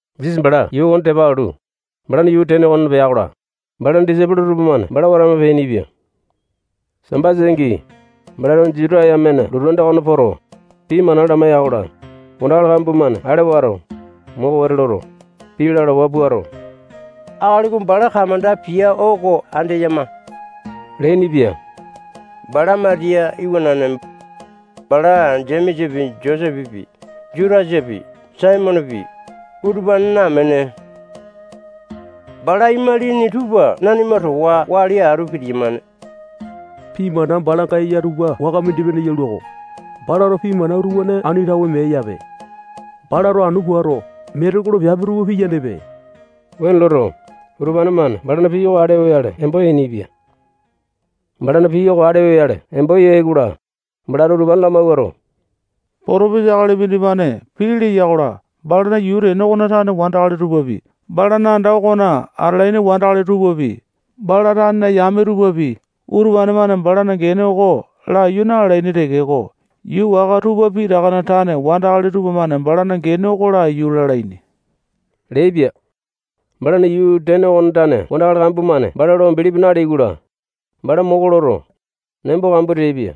Jisasa bala yuu okone tepa alu, balana yuu tene okona pea-kola, balana disaipolo tupamane bala watama peainipia. Sambasa angi, balato Juta yamena lotu anda okona poto, pii mana lamaiya-kola, wandakali kambua-mane ale wato, moko wete loto, pii lalawa puato, akali oko bala kamanda pia oko andeyama leainipia. Bala Matiya iwanane. Bala Jemesapi, Josepepi, Jutasapi, Saimonepi, utupanena amene. Bala imalini tupa nanima towa wali atu pitiyamane. Pii mana balanga eya tupa waka mindi-pene yalua-ko. Balato pii mana utupane ani tawe meae-yape. Balato anu puato, metekolo piape tupa piyanepe. Wuane loto, utupane-mane balana pii oko ale oyale embo yainipia. Balana pii ale oyale embo yai-kola, balato utupane lamawuato, potopesa akali mindimane pii leya-kola, balana yuu tene okona tane wandakali tupapi, balana anda okona atalaini wandakali tupapi, bala tanena yame tupapi, utupane-mane balana gene oko laiyu na-lalaini tekeko, yuu waka tupa pitakana tane wandakali tupamane balana gene oko laiyu lalaini leaipia. Balana yuu tene okona tane wandakali kambua-mane bala lo bilipi naleai-kola, bala moko loto, nembo kambua teaipia.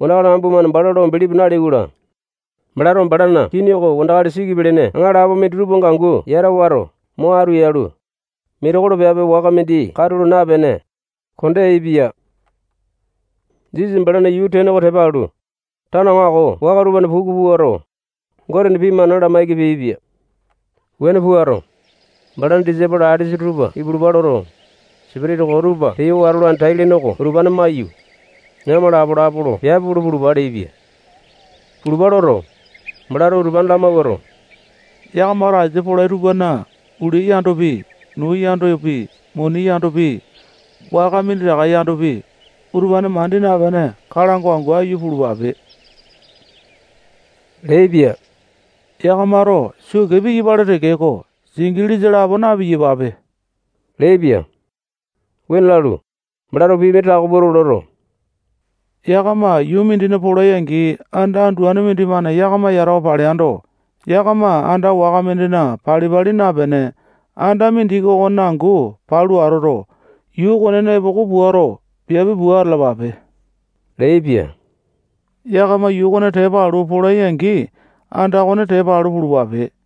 Wandakali kambua-mane bala lo bilipi naleai-kola, balato balana kini oko wandakali siki pelene aŋalapo minditupanga angu yata wato, mo atu yalu, metekolo piape waka mindi katulo napene, konda yaepia. Jisasa balana yuu tene oko tepa alu, tano aŋako waka tupana puku puato, Gotena pii mana lamaiki peaipia. Wuane puato, balana disaipolo alesa tupa ipulupa loto, sipitisa koo tupa peyo watolane tai-lene oko utupane maiyu, yakama lapo-lapo lo piape pulu pulupa leaipia. Pulupa loto, balato utupane lamawuato, yakamato asia polai tupana ulia yandopi, nuu yandopi, muni yandopi, waka minditaka yandopi, utupane mandi napene, kalango angu aiyu pulupape leaipia. Yakamato sukee piyapale tekeko, singilisa lapo na-piyapape leaipia. Wuane lalu, balato pii mindi tako pua loto, yakama yuu mindina polai-angi, anda anduane mindimane yakama yatawa paleando, yakama anda waka mindina pali-pali napene, anda mindiki okonena angu palu atoto, yuu okonena epoko puato, piape pua atalapape leaipia. Yakama yuu okone tepa alu, polai-angi, anda okone tepa alu, pulupape.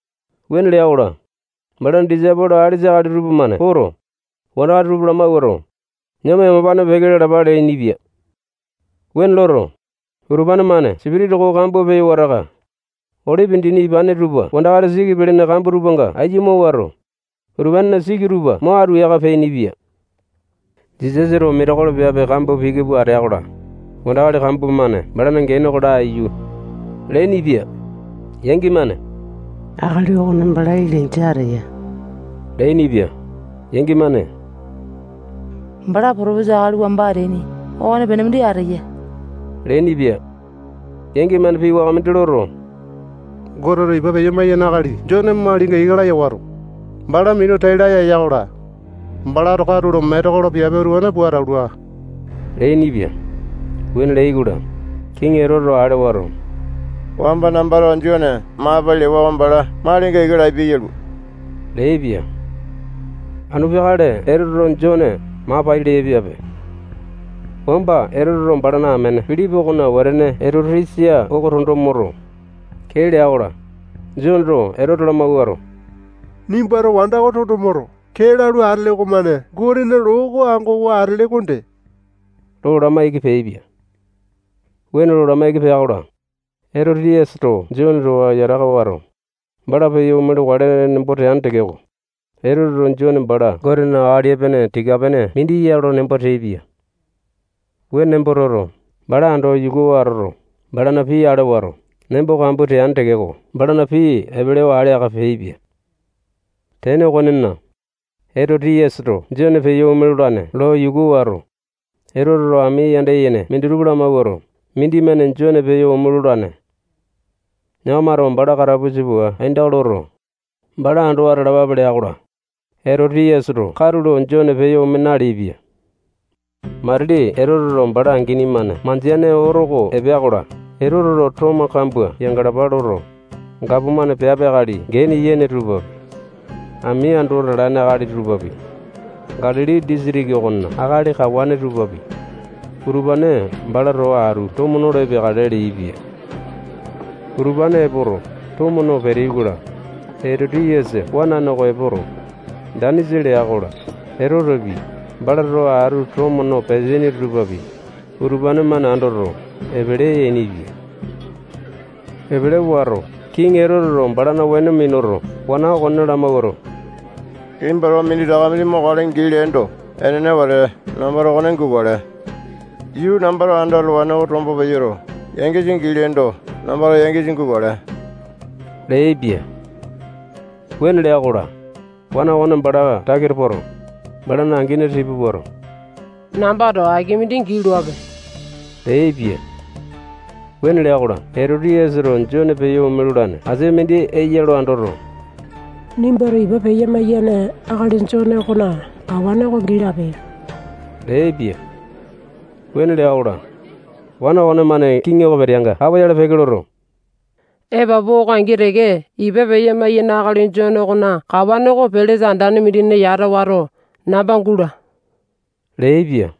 Wuane lea-kola, balana disaipolo alesa akali tupamane poto, wandakali tupa lamawuato, yakama yamapane peke lalapa leainipia. Wuane loto, utupane-mane sipitisa koo kambua peyo wataka, olipi dini ipane tupa wandakali siki pelene kambua tupanga aiya amawuato, utupanena siki tupa mo atu yaka peainipia. Jisasato metekolo piape kambua piki pua atea-kola, wandakali kambua-mane balana gene oko laiyu leainipia. Yangi-mane akali okone bala Ilainja ateya leainipia. Yangi-mane bala potopesa akali wamba ateaini okonepene mindi ateya leainipia. Yangi-mane pii waka mindi loto, Goteto ipa peya-maiyane akali Jone malinga ika laya wato, bala minu tai laya eya-kola, balato katulo metekolo piape utupane pua atalua leainipia. Wuane leai-kola, kiŋi Etoteto ale wato, wamba nambato Jone maa pai lewa oko bala malinga ika lapia yalua leaipia. Anu peakale Etoteto Jone maa pai leaipiape. Wamba Etoteto balana amene Pilipi okona wetene Etoti-yasa oko tondo moto, kee lea-kola, Joneto Etote lamawuato, nimbato wanda oko tondo moto, kee lalu atele okomane Gotena loo oko angowa atele okonde lo lamaiki peaipia. Wuane lo lamaiki pea-kola, Etoti-yasato Jone towa yataka wato, bala peyo ome lokale nembo teane tekeko, Etoteto Jone bala Gotena akali epene tika-pene mindi ya lo nembo teaipia. Wuane nembo toto, bala ando yukuwa atoto, balana pii ale wato, nembo kambua teane tekeko, balana pii epelewa ale aka peaipia. Tene okonena, Etoti-yasato Jone peyo ome lolane lo yuku wato, Etoteto ami yanda yene minditupa lamawuato, mindimane Jone peyo ome lolane. Yakamato bala katapusa pua aindaka loto, bala ando atalapape lea-kola, Etoti-yasato katulo Jone peyo ome naleaipia. Matili Etote bala angini-mane mandeane oto oko epea-kola, Etoteto tomo kambua yangalapa loto, gapomane piape akali gene yene tupapi, ami ando atalaini akali tupapi, Galili disitiki okona akali kawane tupapi, utupane bala towa atu tomo nolo epeakale leaipia. Utupane epoto, tomo no peteai-kola, Etoti-yasa wanane oko epoto, danisa lea-kola, Etotepi, bala towa atu tomo no peteaini tupapi, utupane-mane andoto, epele yainipia. Epele wato, kiŋi Etoteto balana weno minuto, wana okone lamawuato, nimbato minditaka mindi mokale gii leendo, enene wete, nambato okone gukale. Yuu nambato ando atalawane oko tombo peyoto, yangisa gii leendo, nambato yangisa gukale leaipia. Wuane lea-kola, wana okone bala takita poto, balana angini tipa puato, nambato aki mindi gii loape leaipia. Wuane lea-kola, Etoti-yasato Jone peyo ome lolane asia mindi eya ya lo andoto, nimbato ipa peya-maiyane akali Jone okona kawane gii lape leaipia. Wuane lea-kola, wana okonemane kiŋi oko peteanga kapoyale peke loto, epapu oko angi teke, ipa peya-maiyane akali Jone okona kawane oko pelesa andane mindina yata wato, namba gula leaipia.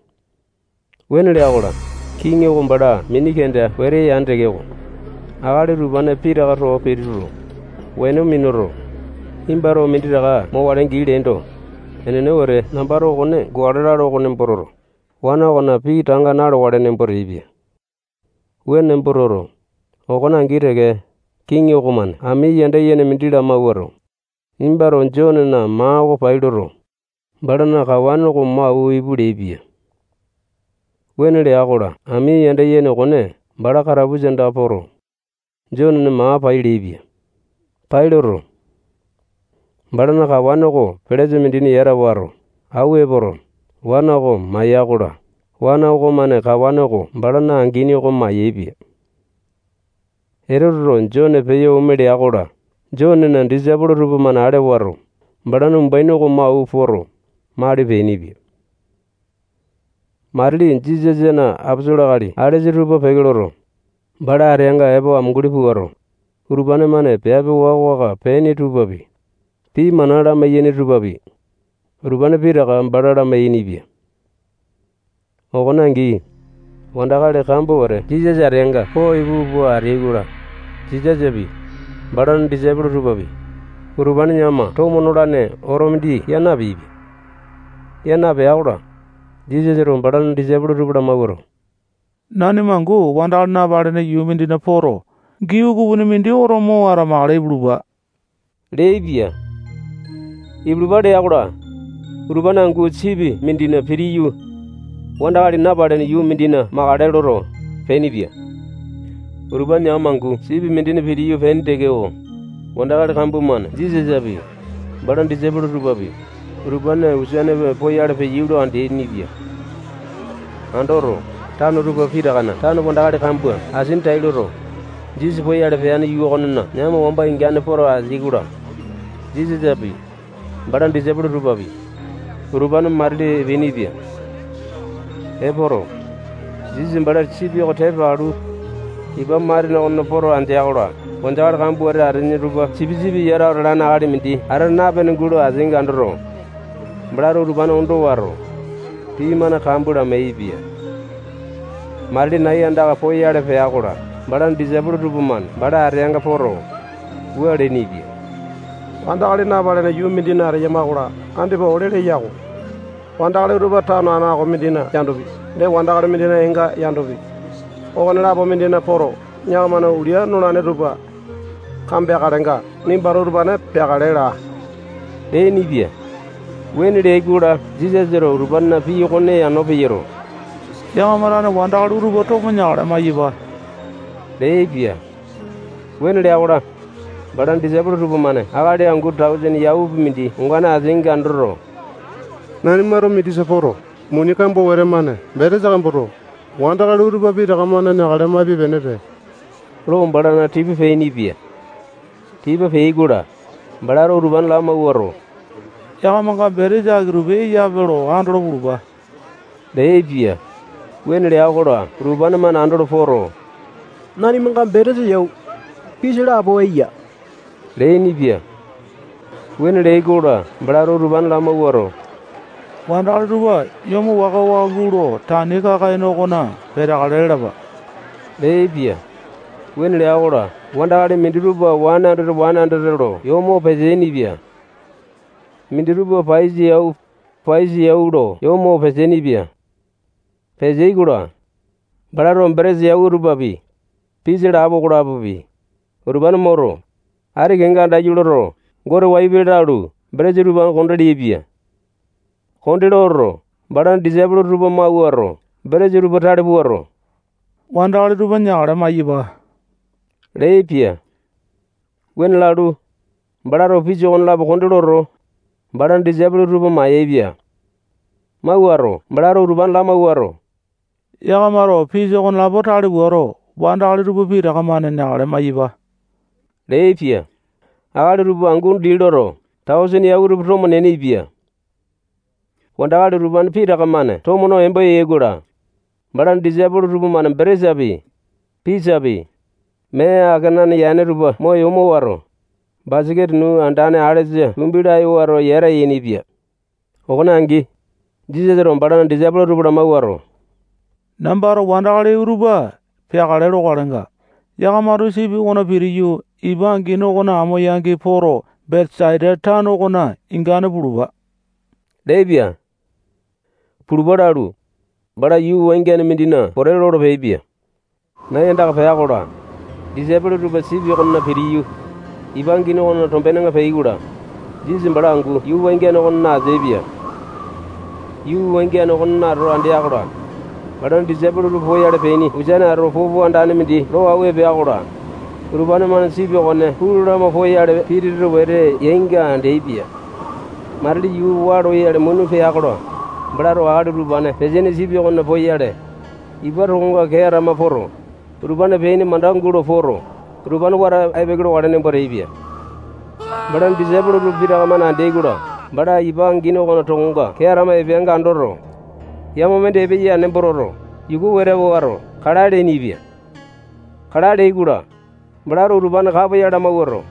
Wuane lea-kola, kiŋi oko bala mini kenda wete yane tekeko, akali utupane pitaka towa pituto, weno minuto, nimbato minditaka mokale gii leendo, enene wete nambato okone gukale lalo oko nembo toto, wana okona pii tanga na-lokale nembo teaipia. Wuane nembo toto, okone angi teke, kiŋi okomane ami yanda yene mindi lamawuato, nimbato Jonena maa oko pai loto, balana kawane oko mo awua ipu leaipia. Wuane lea-kola, ami yanda yene okone bala katapusa andaka poto, Jonena maa pai leaipia. Pai loto, balana kawane oko pelesa mindina yata wato, awua epoto, wana oko maya-kola, wana okomane kawane oko balana angini oko mayaepia. Etoteto Jone peyo ome lea-kola, Jonena disaipolo tupamane ale wato, balana umbuaini oko mo awua poto, mali peainipia. Matili Jisasana aposolo akali alesa tupa peke loto, bala ateanga epo amunguli puato, utupane-mane piape waka-waka peaini tupapi, pii mana lamai-yaini tupapi, utupane pitaka bala lamai-yainipia. Okone angi, wandakali kambua wete Jisasa ateanga po ipu pua ateai-kola, Jisasapi, balana disaipolo tupapi, utupane yakama tomo nolane oto mindi yaa napeaipia. Yaa napea-kola, Jisasato balana disaipolo tupa lamawuato, nanima angu wandakali napalene yuu mindina poto, gii ukupini mindi oto mo atamakale ipulupa leaipia. Ipulupa lea-kola, utupane angu sipi mindina pitiyu, wandakali napalene yuu mindina makale loto, peainipia. Utupane yakama angu sipi mindina pitiyu peaini tekeko, wandakali kambua-mane Jisasapi, balana disaipolo tupapi, utupane ukusane poyale peyai lo andeaini-pia. Andoto, tano tupa pitakana tane wandakali kambua asini tai loto, Jisasa poyale peane yuu okonena yakama wamba ini ingane poto ateai-kola, Jisasapi, balana disaipolo tupapi, utupane matili epeainipia. Epoto, Jisasa bala sipi oko tepa alu, ipa matene okona poto andea-kola, wandakali kambua wete ateaini tupa sipisipi yatawa atalane akali mindi ata napene gulo ateainga andoto, balato utupane ondo wato, pii mana kambua lamai-yaepia. Matili nai andaka poyale pea-kola, balana disaipolo tupamane bala ateanga poto, wua leainipia: Wandakali napalene yuu mindina ateyama-kola, andipa ole leya-ko. Wandakali utupa tano aŋako mindina yandopi, wandakali mindina eenga yandopi, okonelapo mindina poto, yakamana ulia nolane tupa kambea-kalenga, nimbato utupane peakale laa leainipia. Wuane leai-kola, Jisasato utupanena pii okone yano peyoto, yakama tane wandakali utupa tomo neakale maiyapa leaipia. Wuane lea-kola, balana disaipolo tupamane akali angu tausene yaupi mindi ongane ateainga andoto, nanimato mindisa poto, muni kambua wete-mane betesa kamboto, wandakali utupa pitaka-mane neakale maipe-penepe lo bala tipa peainipia. Tipa peai-kola, balato utupane lamawuato, yakamanga betesa aki-tupi eyape lo andolo pulupa leaipia. Wuane lea-kola, utupane-mane andolo poto, nanimanga betesa yau, pisa lapo eya leainipia. Wuane leai-kola, balato utupane lamawuato, wandakali tupa yomo waka-waka gulo tani kaka-ene okona peteakale lalapa leaipia. Wuane lea-kola, wandakali minditupa wane andete, wane andete lo yomowa peteaini-pia. Minditupa paiyasa yau, paiyasa yau lo yomowa peteaini-pia. Peteai-kola, balato betesa yau tupapi, pisa lapo okolapi, utupane moto, ati kenga andaiyu loto, Gote wayu pele lalu, betesa tupa konde leaipia. Konde loto, balana disaipolo tupa mawuato, betesa utupa tale puato, wandakali tupa neakale maiyapa leaipia. Wuane lalu, balato pisa okonelapo konde loto, balana disaipolo tupa mayaepia. Mawuato, balato utupane lamawuato, yakamato pisa okonelapo tale puato, wandakali tupa pitaka-mane neakale maiyapa leaipia. Akali tupa angu dii loto, tausene yau tupa tomo neainipia. Wandakali utupane pitaka-mane tomo no embo yai-kola, balana disaipolo tupamane betesapi, pisapi, mee akenane yane tupa mo yomo wato, basaketa nuu andane alesa tumbi laya wato, yata yainipia. Okone angi, Jisasato balana disaipolo tupa lamawuato, nambato wandakali utupa peakale lokalenga, yakamato sipi okona pitiyu, ipa angini okona amo-yangi poto, Betesaita tano okona ingane pulupa leaipia. Pulupa lalu, bala yuu wangiane mindina pote lolo peaipia. Nai andaka pea-kola, disaipolo tupa sipi okona pitiyu, ipa angini okona tombenenga peai-kola, Jisasa bala angu yuu wangiane okonena ateaipia. Yuu wangiane okonena ato andea-kola, balana disaipolo tupa poyale peaini ukusane ato popo andane mindi lo awua epea-kola, utupane-mane sipi okone pulu lama poyale pitete wete yainga andeaipia. Matili yuu waa loyale muna pea-kola, balato akali utupane peteaini sipi okona poyale, ipa tokonga kee atama poto, utupane peaini mandaka gulo poto, utupane wata ai-peke lokale nembo teaipia. Balana disaipolo tupa pitaka-mane andeai-kola, bala ipa angini okona tokonga kee atama epeanga andoto, yama mindi epeya nembo toto, yuku wete wato, kalae leainipia. Kalae leai-kola, balato utupane kapoyale lamawuato,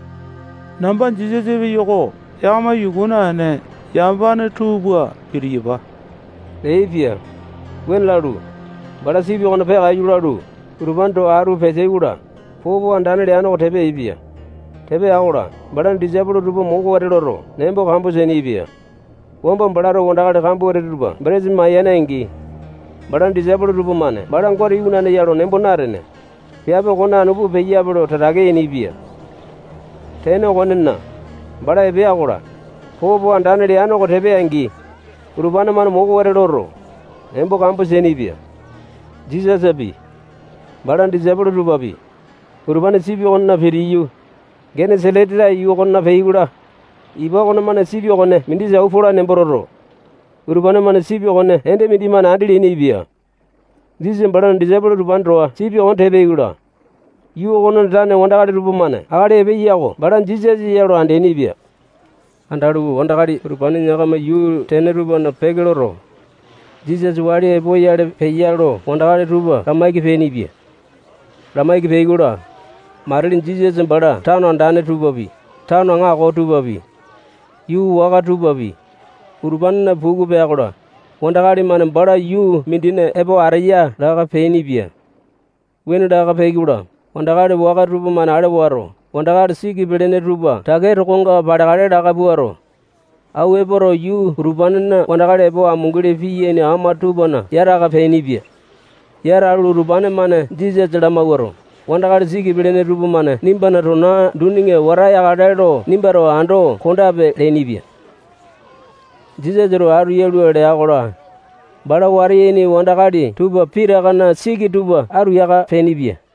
namba Jisasa epeyo-ko. Yakama yuku naene, yamapane tuu pua pitiyapa leaipia. Wuane lalu, bala sipi okona peakaiyu lalu, utupane towa atu peteai-kola, popo andane leane oko tepa yaepia. Tepa ya-kola, balana disaipolo tupa moko wete loto, nembo kambua teainipia. Wamba balato wandakali kambua wete tupa betesa mayane-angi, balana disaipolo tupamane bala Gotena Iwanane ya lo nembo natene, piape okone anu pua peyape lo tatake yainipia. Tene okonena, bala epea-kola, popo andane leane oko tepa ya-angi, utupane-mane moko wete loto, nembo kambua teainipia. Jisasapi, balana disaipolo tupapi, utupane sipi okona pitiyu, Genesa-leta yuu okona peai-kola, ipa okomane sipi okone mindisa awua polane nembo toto, utupane-mane sipi okone ende mindimane andi leainipia. Jisasa balana disaipolo utupane towa sipi okone tepa yai-kola, yuu okonena tane wandakali tupamane akali epeya oko bala Jisasa ya lo andeaini-pia. Andalu, wandakali utupane yakamana yuu tene tupana peke loto, Jisasa wali epoyale peya lo wandakali tupa lamaiki peainipia. Lamaiki peai-kola, matili Jisasa bala tano andane tupapi, tano aŋako tupapi, yuu waka tupapi, utupanena puku pea-kola, wandakali-mane bala yuu mindina epo ateya laka peainipia. Wuane laka peai-kola, wandakali waka tupamane ale wato, wandakali siki pelene tupa takea tokonga paleakale laka puato, awua epoto, yuu utupanena wandakali epo amunguli piyaini ama tupana yata aka peainipia. Yata alu, utupane-mane Jisasa lamawuato, wandakali siki pelene tupamane nimbana tona duninga wata yakale lo nimbato ando kondape leainipia. Jisasato atu yalua lea-kola, bala wata yaini wandakali tupa pitakana siki tupa atu yaka peainipia.